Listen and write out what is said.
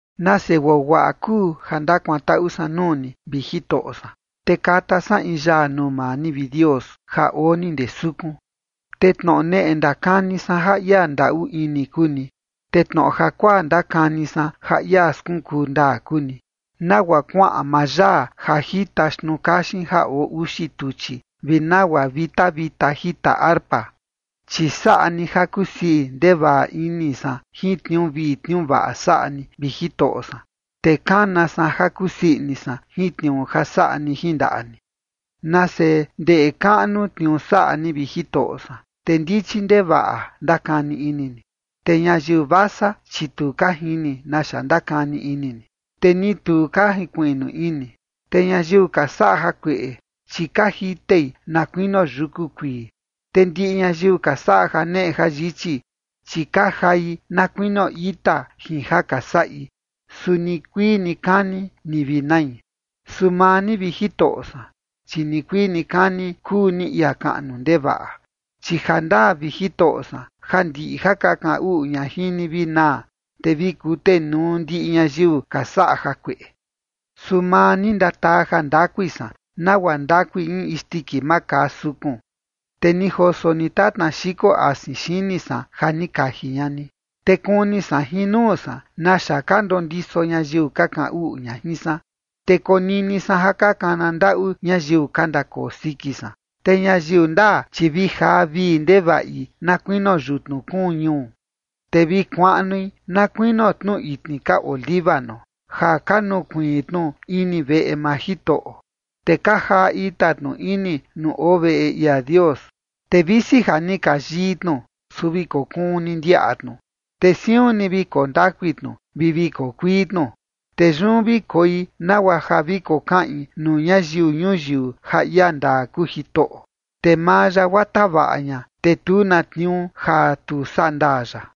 Nase guaguaꞌa kuu ja ndakuantaꞌu san nuu ni, vi Jitoꞌo san, te kata san in yaa nuu maa ni, vi Dios, ja oo ni ndee sukun. Te tnoꞌo neꞌe ndakani san ja ia ndaꞌu ini kuu ni, te tnoꞌo jakuaa ndakani san ja ia skunkuu ndaa kuu ni, nagua kuaꞌan maa yaa ja jita xtnuu kaxin ja oo uxi tuchi, vi nagua vita vita jita arpa. Chi saꞌa ni ja kusii ndevaꞌa ini san jin tniuu vii tniuu vaꞌa saꞌa ni, vi Jitoꞌo san, te kana san ja kusii ini san jin tniuu ja saꞌa ni jin ndaꞌa ni. Nase ndeꞌe kaꞌnu tniuu saꞌa ni, vi Jitoꞌo san, te ndichi ndevaꞌa ndakani ini ni. Te ñayiu vasa, chi tu ka jini naxa ndakani ini ni, te ni tu ka jinkuiꞌnu ini. Te ñayiu ka saꞌa jakueꞌe, chi ka jitei na kuinio yuku kuii, te ndiꞌi ñayiu ka saꞌa janeꞌe jayichi, chi ka jai na kuinio ita jin ja ka saꞌi, su nikuii nikani ni vi nai. Su maa ni, vi Jitoꞌo san, chi nikuii nikani kuu ni ia kaꞌnu ndevaꞌa. Chi jandaa, vi Jitoꞌo san, ja ndiꞌi ja ka kaꞌan uꞌu ña jin ni vi naa, te vi kutenuu ndiꞌi ñayiu ka saꞌa jakueꞌe. Su maa ni, ndataa jandakui san, nagua ndakui in isndiki makaa sukun. Te ni joso ni tatna xiko asin xini san ja ni kaji ña ni. Te kuni san jin nuu san naxa ka ndondiso ñayiu ka kaꞌan uꞌu ña jin san, te konini san ja ka kana ndaꞌu ñayiu ka ndakoo siki san. Te ñayiu ndaa, chi vi jaa vii ndevaꞌi na kuinio yutnu kuun ñuu, te vi kuaꞌnui na kuinio tnu itni ka oo Líbano, ja ka nukuiin tnu ini veꞌe maa Jitoꞌo, te ka jaa ita tnu ini nuu oo veꞌe ia Dios. Te visi ja ni ka yii tnu, su vi kokuun ni ndiaꞌa tnu, te siun ni vi koo ndakui tnu vi vi koo kuii tnu. Te yun vi koi nagua ja vi kokaꞌin nuu ñayiu ñuyiu ja ia ndaa kuu Jitoꞌo, te maa ya guaa tavaꞌa ña, te tu na tniuu ja tu saꞌa ndaa ya.